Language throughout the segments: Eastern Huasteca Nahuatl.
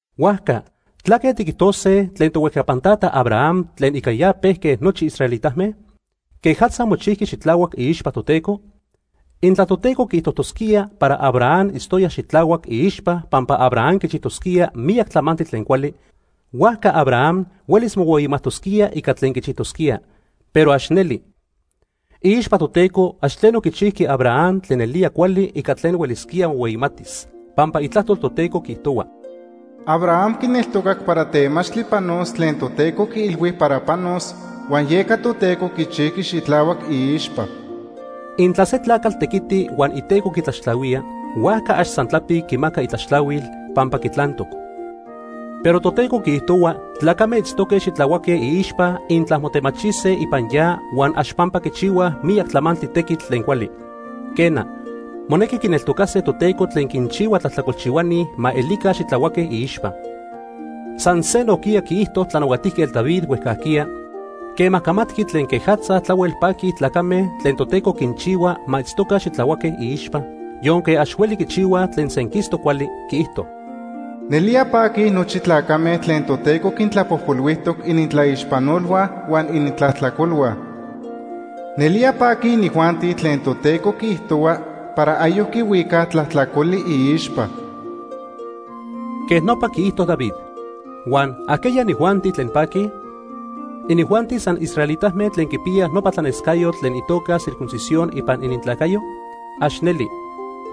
Huajca ¿tlaque tiquijtose tlen tohuejcapan tata Abraham tlen ica ya pejque nochi israelitame? ¿Quejatza mochijqui xitlahuac iixpa Toteco? Intla Toteco quiijtojtosquía para Abraham itztoya xitlahuac iixpa pampa Abraham quichijtosquía miyac tlamantli tlen cuali, huajca Abraham huelis mohueyimajtosquía ica tlen quichijtosquía. Pero ax neli. Iixpa Toteco ax tleno quichijqui Abraham tlen nelía cuali ica tlen huelisquía mohueyimatis. Pampa Itlajtol Toteco quiijtohua: “Abraham quineltocac para temachtli panos tlen Toteco quiilhui para panos, huan yeca Toteco quichijqui xitlahuac iixpa.” Intla se tlacatl tequiti huan iteco quitlaxtlahuía, huajca ax san tlapic quimaca itlaxtlahuil, pampa quitlantoc. Pero Toteco quiijtohua tlacame itztoque xitlahuaque iixpa intla motemachise ipan ya huan ax pampa quichihuaj miyac tlamantli tequitl tlen cuali. Quena, monequi quineltocase Toteco tlen quinchihua tlajtlacolchihuani ma elica xitlahuaque iixpa. San se nojquiya quiijto Tlanahuatijquetl David huejcajquiya, quema camatqui tlen quejatza tlahuel paquij tlacame tlen Toteco quinchihua ma itztoca xitlahuaque iixpa, yonque ax hueli quichihuaj tlen senquistoc cuali. Quiijto: “Nelía paquij nochi tlacame tlen Toteco quintlapojpolhuijtoc inintlaixpanolhua huan inintlajtlacolhua. Nelía paquij inijuanti tlen Toteco quiijtohua para ayoc quihuicaj tlajtlacoli iixpa.” Quej nopa quiijto David. Huan ¿ajqueya inijuanti tlen paquij? ¿Inijuanti san israelitame tlen quipiyaj nopa tlanescayotl tlen itoca circuncisión ipan inintlacayo? ¡Ax neli!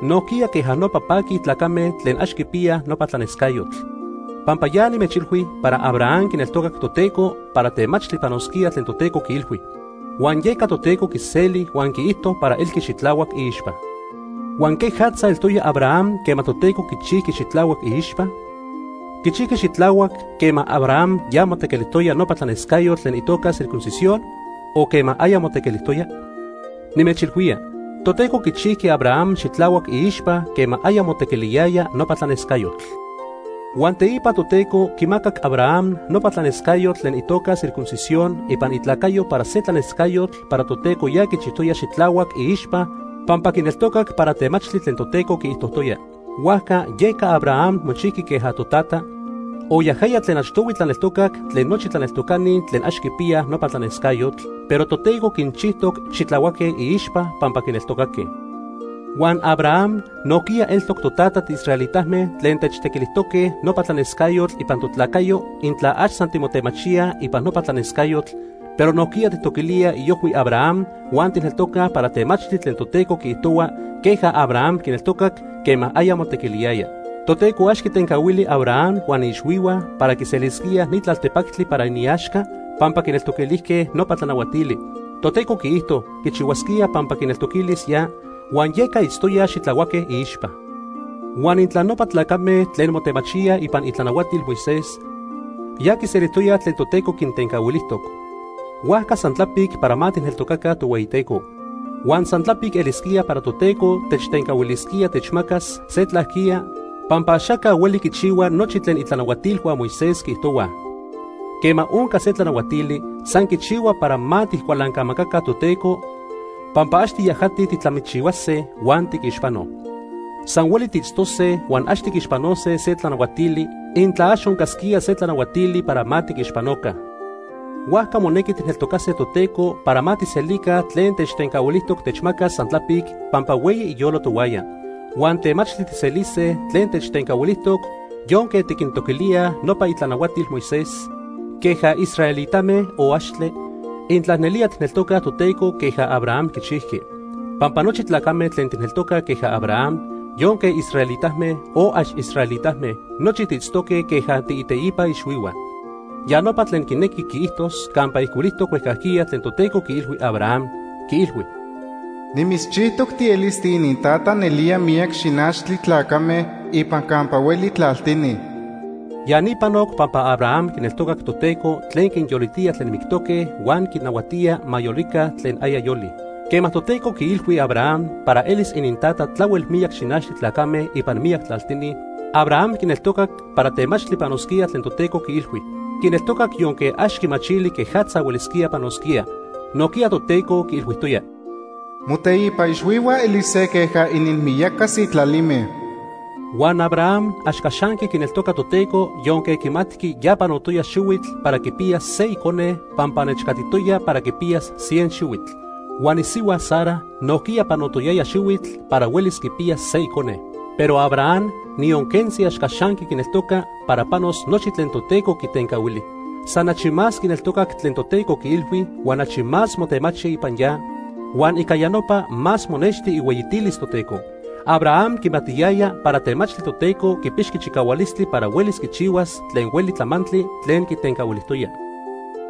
Nojquiya queja nopa paquij tlacame tlen ax quipiyaj nopa tlanescayotl. Pampa ya nimechilhui para Abraham quineltocac Toteco para temachtli panosquía tlen Toteco quiilhui, huan yeca Toteco quiseli huan quiijto para elqui xitlahuac iixpa. ¿Huan quejatza eltoya Abraham quema Toteco quichijqui xitlahuac iixpa? ¿Quichijqui xitlahuac quema Abraham ya motequilijtoya nopa tlanescayotl tlen itoca circuncisión, o quema aya motequilijtoya? Nimechilhuía, Toteco quichijqui Abraham xitlahuac iixpa quema aya motequiliyaya nopa tlanescayotl. Huan teipa Toteco quimacac Abraham nopa tlanescayotl tlen itoca circuncisión ipan itlacayo para se tlanescayotl para Toteco ya quichijtoya xitlahuac iixpa pampa quineltocac para temachtli tlen Toteco quiijtojtoya. Huajca yeca Abraham mochijqui queja totata, o yajaya tlen achtohui tlaneltocac tlen nochi tlaneltocani tlen ax quipiyaj nopa tlanescayotl, pero Toteco quinchijtoc xitlahuaque iixpa pampa quineltocaque. Huan Abraham nojquiya eltoc totata tiisraelitame tlen techtequilijtoque nopa tlanescayotl ipan totlacayo intla ax san timotemachíaj ipan nopa tlanescayotl, pero nojquiya tijtoquilíaj iojhui Abraham huan tijneltocaj para temachtli tlen Toteco quiijtohua queja Abraham quineltocac quema aya motequiliyaya. Toteco ax quitencahuili Abraham huan iixhuihua para quiselisquíaj ni tlaltepactli para iniaxca pampa quinneltoquilijque nopa tlanahuatili. Toteco quiijto quichihuasquía pampa quineltoquilis ya, huan yeca itztoyaj xitlahuaque iixpa. Huan intla nopa tlacame tlen motemachíaj ipan itlanahuatil Moisés, ya quiselijtoyaj tlen Toteco quintencahuilijtoc; huajca san tlapic para ma tijneltocaca Tohueyiteco. Huan san tlapic elisquía para Toteco techtencahuilisquía techmacas se tlajquiya pampa axaca hueli quichihua nochi tlen itlanahuatilhua Moisés quiijtohuaj. Quema onca se tlanahuatili, san quichihua para ma tijcualancamacaca Toteco pampa ax tiyajatij tijtlamichihuase, huan tiquixpanoj. San hueli tiitztose huan ax tiquixpanose se tlanahuatili, intla ax oncasquía se tlanahuatili para ma tiquixpanoca. Huajca monequi tijneltocase Toteco para ma tijselica tlen techtencahuilijtoc techmacas san tlapic pampa hueyi iyolo tohuaya. Huan temachtli tijselise tlen techtencahuilijtoc yonque tiquintoquilíaj nopa itlanahuatil Moisés queja israelitame o axtle, intla nelía tijneltocaj Toteco queja Abraham quichijqui. Pampa nochi tlacame tlen tijneltocaj queja Abraham, yonque israelitame, o ax israelitame, nochi tiitztoque queja tiiteipa ixhuihua. Ya nopa tlen quinequi quiijtos campa ijcuilijtoc huejcajquiya tlen Toteco quiilhui Abraham, quiilhui: “Nimitzchijtoc tielis tiinintata nelía miyac xinachtli tlacame ipan campa hueli tlaltini.” Ya ni panoc pampa Abraham quineltocac Toteco tlen quinyolitía tlen mictoque huan quinnahuatía ma yolica tlen aya yolij. Quema Toteco quiilhui Abraham para elis inintata tlahuel miyac xinachtli tlacame ipan miyac tlaltini, Abraham quineltocac para temachtli panosquía tlen Toteco quiilhui. Quineltocac yonque ax quimachili quejatza huelisquía panosquía. Nojquiya Toteco quiilhuijtoya: “Moteipa ixhuihua elise queja ininmiyaca sitlalime.” Huan Abraham ax caxanqui quineltoca Toteco yonque quimatqui ya panotoya xihuitl para quipiyas se icone pampa nechcatitoya para quipiyas cien xihuitl. Huan isihua Sara nojquiya panotoyaya xihuitl para huelis quipiyas se icone. Pero Abraham, niyon quentzi ax caxanqui quineltoca para panos nochi tlen Toteco quitencahuili. San achi más quineltocac tlen Toteco quiilhui, huan achi más motemachi ipan ya, huan ica ya nopa más monexti ihueyitilis Toteco. Abraham quimatiyaya para temachtli Toteco quipixqui chicahualistli para huelis quichihuas tlen hueli tlamantli tlen quitencahuilijtoya.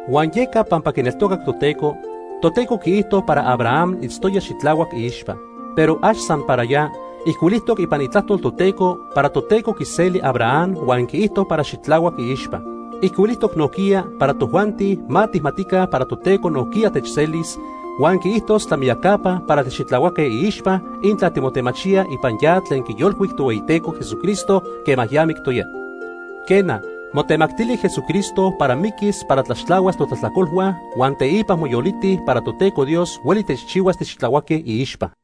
Huan yeca pampa quineltocac Toteco, Toteco quiijto para Abraham itztoya xitlahuac iixpa. Pero ax san para ya, ijcuilijtoc ipan Itlajtol Toteco para Toteco quiseli Abraham huan quiijto para xitlahuac iixpa. Ijcuilijtoc nojquiya para tojuanti ma tijmatica para Toteco nojquiya techselis, huan quiijtos tlamiyacapa para tixitlahuaque iixpa intla timotemachíaj ipan ya tlen quiyolcuic Tohueyiteco Jesucristo quema ya mictoya. Quena, motemactili Jesucristo para miquis para tlaxtlahuas totlajtlacolhua huan teipa moyoliti para Toteco Dios hueli techchihuas tixitlahuaque iixpa.